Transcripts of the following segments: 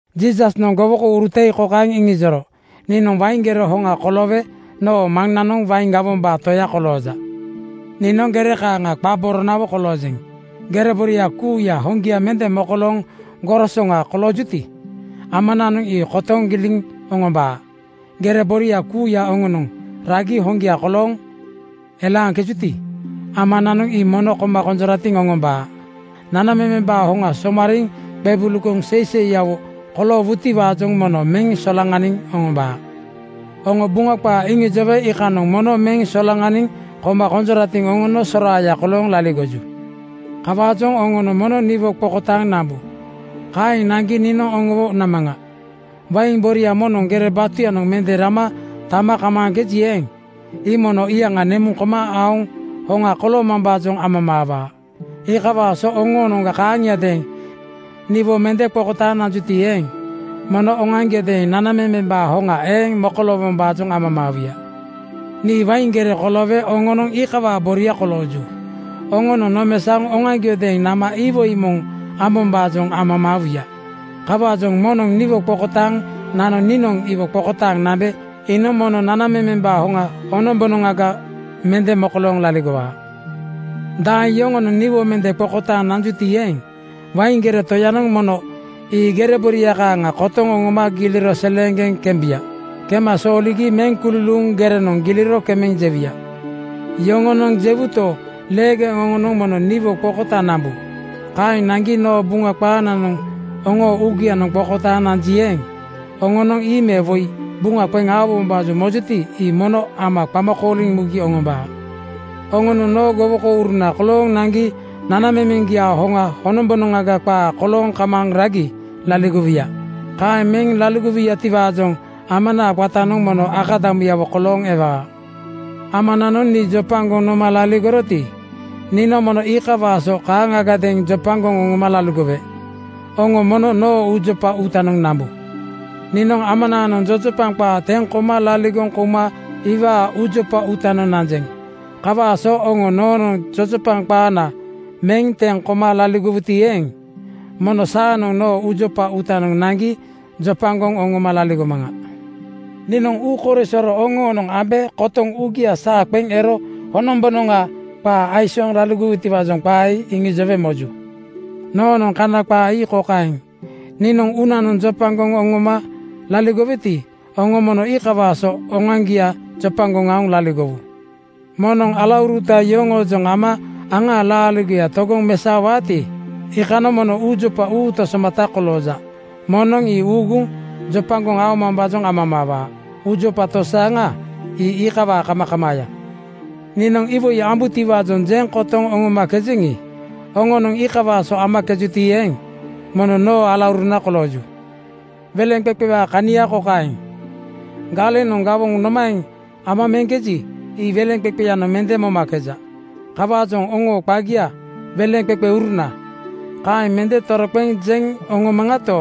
Jiisasnoŋ gowokouruta ii kokaeŋ iŋijoro, “Niinoŋ wain gere hoŋa koloowe noo Maŋnanoŋ wain gawombaa toya kolooja. Niinoŋ gere kaaŋa qa boronawo koloojeŋ. Gere boria kuuya hoŋgia mende mokolooŋ gorosoŋa koloojuti, Amananoŋ ii kotoŋ giliŋ oŋombaa. Gere boria kuuya noonoŋ ragi hoŋgia kolooŋ elaaŋkejuti, Amananoŋ ii mono koma konjoratiŋ oŋombaa. Nanamemembaa hoŋa somariiŋ qebulugoŋ seiseiyawo koloowuti-waajoŋ mono meŋ solaŋaniŋ oŋombaa. “Oŋo Buŋa qaa iŋijowe iikanoŋ mono meŋ solaŋaniŋ koma konjoratiŋ oŋono soraaya kolooŋ laligoju. Kawaajoŋ oŋonoŋ mono niwo qokotaaŋ nambu. Kaeŋ naŋgi niinoŋ oŋowo namaŋa. Wain boria moŋnoŋ gere batuyanoŋ mende rama tama kamaaji eeŋ, ii mono iyaŋa nemuŋ koma aoŋ hoŋa koloomambaajoŋ amamaawaa. Iikawaa so oŋonoŋ kaaŋiadeeŋ niwo mende qokotaaŋ nanjuti eeŋ, mono oŋoaŋgiodeeŋ nanamemembaa hoŋa eeŋ mokoloowom-baajoŋ amamaawuya. “Nii wain gere koloowe oŋonoŋ iikawaa boria kolooju. Oŋonoŋ nomesaoŋ oŋoaŋgiodeeŋ nama iwoi moŋ ambombaajoŋ amamaa-wuya. Kawaajoŋ moŋnoŋ niwo qokotaaŋ nano niinoŋ iwo qokotaaŋ nambe iinoŋ mono nanamemembaa hoŋa honombonoŋga mende mokolooŋ laligowaa. Daeŋ yoŋonoŋ niwo mende qokotaaŋ nanjuti eeŋ, wain gere toyanoŋ mono ii gere boria kaaŋa kotoŋ oŋoma giliro seleeŋgeŋ kembuya. Kema sooligi meŋ kululuuŋ gerenoŋ giliro kemeŋ jewuya. “Yoŋonoŋ jewuto, leegeŋ oŋonoŋ mono niwo qokotaaŋ nambu. Kaeŋ naŋgi noo Buŋa qaananoŋ oŋoo uugianoŋ qokotaaŋ nanji eeŋ, oŋonoŋ ii me woi buŋa qeŋ aowombaajoŋ mojuti, ii mono Ama qama kooliŋ mugi oŋombaa. Oŋonoŋ noo gowokouruna kolooŋ naŋgi nanamemeŋgiaa hoŋa honombonoŋga qaa kolooŋ kamaaŋ ragi laligowuya. Kaeŋ meŋ laligowuyatiwaajoŋ Amanaa qatanoŋ mono akadamuyawo kolooŋ ewaa. Amananoŋ nii jopagoŋ noma laligoroti, niinoŋ mono iikawaa so kaaŋgadeeŋ jopagoŋ oŋoma laligowe. Oŋo mono noo uujopa uutanoŋ nambu. Niinoŋ Amanaanoŋ jojopaŋ qaa teŋ koma laligoŋ kouma iwaa uujopa uutanoŋ nanjeŋ. Kawaa so oŋo noonoŋ jojopaŋ qaana meŋ teŋ koma laligowuti eeŋ, mono saanoŋ noo uujopa uutanoŋ naŋgi jopagoŋ oŋoma laligomaŋa. “Niinoŋ uu korisoro oŋoonoŋ ambe kotoŋ uugia saa qeŋ ero honombonoŋa qaa aisooŋ laligowutiwaajoŋ qaa ii iŋijowe moju. Noonoŋ Kana qaa ii kokaeŋ: Niinoŋ uunanoŋ jopagoŋ oŋoma laligoweti, oŋo mono iikawaa so oŋoaŋgia jopagoŋ aoŋ laligowu. Moŋnoŋ alauruta yoŋoojoŋ ama aŋaa laaligoya togoŋ mesaowaati, iikanoŋ mono uujopa uuta somata kolooja. Moŋnoŋ ii uuguŋ jopagoŋ oŋomambaajoŋ amamaawaa. Uujopa tosaaŋa ii iikawaa kamakamaaya. “Niinoŋ iwoi ambutiwaajoŋ jeŋ kotoŋ oŋomakejeŋi, oŋonoŋ iikawaa so amakejuti eeŋ, mono noo alauruna kolooju. Weleŋqeqewaa kania kokaeŋ: Galeŋanoŋ gawoŋa nomaeŋ ama meŋkeji, ii weleŋqeqeyanoŋ mende momakeja. Kawaajoŋ oŋoo qagia ‘Weleŋqeqeuruna,’ kaeŋ mende toroqeŋ jeŋ oŋoomaŋato,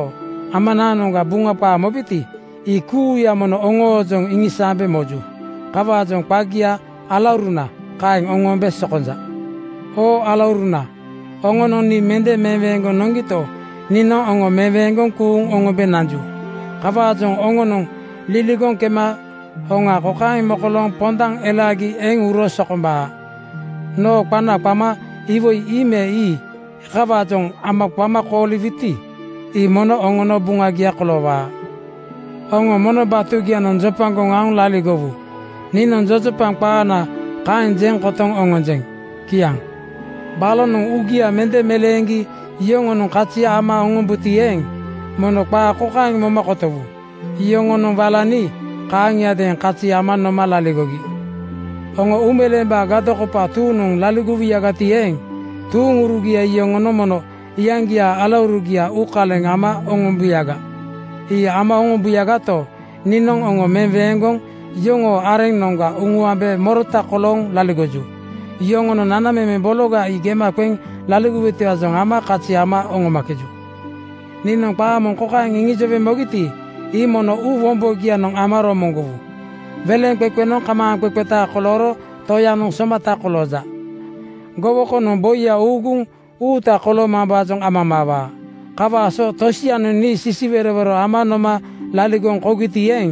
Amanaanoŋga Buŋa qaa mobeti, ii kuuya mono oŋoojoŋ iŋisaambe moju. Kawaajoŋ qagia ‘Alauruna,’ kaeŋ oŋoombe sokonja. “Oo alauruna, oŋonoŋ nii mende meweeŋgoŋ noŋgito, niinoŋ oŋo meweeŋgoŋ kuuŋ oŋombe nanju. Kawaajoŋ oŋonoŋ liligoŋ kema hoŋa kokaeŋ mokolooŋ pondaŋ elaagi eŋ uro sokombaa: Noo qana qama iwoi ii me ii kawaajoŋ Ama qama kooliwuti, ii mono oŋono buŋagia koloowaa. Oŋo mono batugianoŋ jopagoŋ aoŋ laligowu. Niinoŋ jojopaŋ qaana kaeŋ jeŋ kotoŋ oŋonjeŋ.” Kiaŋ. “Balonoŋ uugia mende meleeŋgi yoŋonoŋ kazi ama oŋombuti eeŋ, mono qaa kokaeŋ moma kotowu: Yoŋonoŋ wala nii kaaŋiadeeŋ kazi ama noma laligogi. Oŋo uumeleembaa gadokopa tuuŋnoŋ laligowuyagati eeŋ, tuuŋurugia yoŋonoŋ mono iyaŋgiaa alaurugia uukaleŋ ama oŋombuyaga. Ii ama oŋombuyagato, niinoŋ oŋo meweeŋgoŋ yoŋoo areŋnoŋga uŋuambe morota kolooŋ laligoju. Yoŋoonoŋ nanamemeŋ bologa ii gema qeŋ laligojutiwaajoŋ ama kazi ama oŋomakeju. “Niinoŋ qaa moŋ kokaeŋ iŋijowe mogiti, ii mono uu wombogianoŋ ama romoŋgowu, ‘Weleŋqeqenoŋ kamaaŋqeqeta kolooro toyanoŋ somataya kolooja. Gowokonoŋ boiya uuguŋ uuta koloomambaajoŋ amamaawaa.’ Kawaa so tosianoŋ nii sisiwerowero ama noma laligoŋ kougiti eeŋ,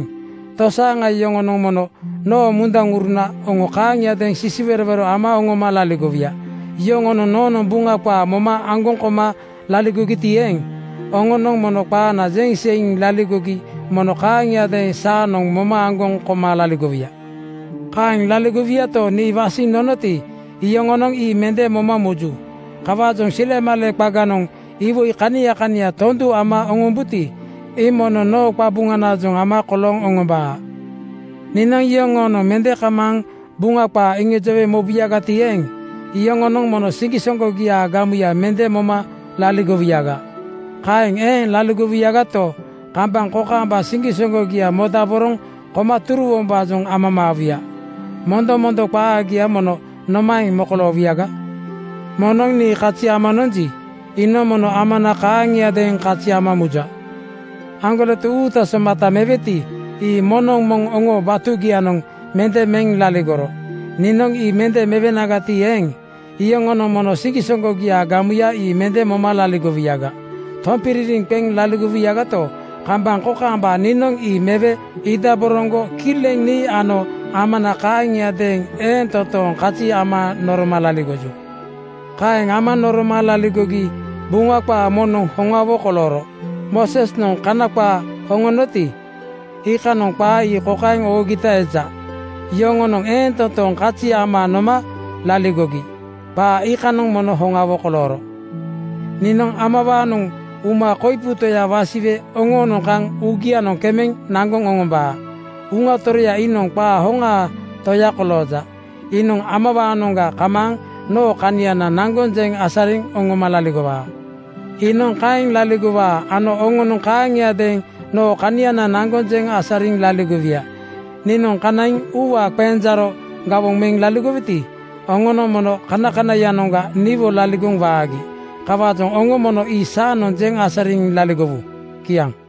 tosaaŋa yoŋonoŋ mono noo munduŋuruna oŋo kaaŋiadeeŋ sisiwerowero ama oŋoma laligowuya. Yoŋonoŋ noonoŋ Buŋa qaa moma aŋgoŋ koma laligogiti eeŋ, oŋonoŋ noo qaana jeŋ seiŋ laligogi mono kaaŋiadeeŋ saanoŋ moma aŋgoŋ koma laligowuya. Kaeŋ laligowuyato, nii wasiŋ nonoti, iyoŋonoŋ ii mende moma muju. Kawaajoŋ silemale qaganoŋ iwoi kania kania tondu ama oŋombuti, ii mono noo qabuŋanaajoŋ ama kolooŋ oŋombaa. “Niinoŋ yoŋoonoŋ mende kamaaŋ Buŋa qaa iŋijowe mobuyagati eeŋ, iyoŋonoŋ mono siŋgisoŋgogiaa gamuya mende moma laligowuyaga. Kaeŋ eeŋ laligowuyagato, kambaŋ kokaamba siŋgisoŋgogia modaboroŋ koma turuwombaajoŋ amamaawuya. Mondomondo qaagia mono nomaeŋ mokoloowuyaga? Moŋnoŋ nii kazi ama nonji, iinoŋ mono Amana kaaŋiadeeŋ kazi ama muja. Aŋgoleto uuta somata meweti, ii moŋnoŋ moŋ oŋoo batugianoŋ mende meŋ laligoro. Niinoŋ ii mende mewenagati eeŋ, iyoŋonoŋ mono siŋgisoŋgogiaa gamuya ii mende moma laligowuyaga. Tompiririŋ qeŋ laligowuyagato, kambaŋ kokaamba niinoŋ ii mewe iidaboroŋgo kileŋ nii ano Amana kaaŋiadeeŋ eeŋ totooŋ kazi ama noroma laligoju. “Kaeŋ ama noroma laligogi Buŋa qaa moŋnoŋ hoŋawo kolooro. Moosesnoŋ kana qaa oŋonoti, iikanoŋ qaa ii kokaeŋ oogita eja, ‘Yoŋonoŋ eeŋ toontooŋ kazi ama noma laligogi.’ Qaa iikanoŋ mono hoŋawo kolooro. Niinoŋ Amawaanoŋ uma koipu Toya wasiwe oŋoonoŋ kaŋ uugianoŋ kemeŋ naŋgoŋ oŋombaa. Uŋa Toroya iinoŋ qaa hoŋaa Toya kolooja. Iinoŋ Amawaanoŋga kamaaŋ noo kaniana naŋgoŋ jeŋ asariŋ oŋoma laligowaa. Iinoŋ kaeŋ laligowaa ano oŋonoŋ kaaŋiadeeŋ noo kaniana naŋgoŋ jeŋ asariŋ laligowuya. Niinoŋ kanaiŋ uuwaa qenjaaro gawoŋ meŋ laligoweti, oŋonoŋ mono kanakanaiyanoŋga niwo laligoŋ waagi. Kawaajoŋ oŋo mono ii saanoŋ jeŋ asariŋ laligowu. Kiaŋ.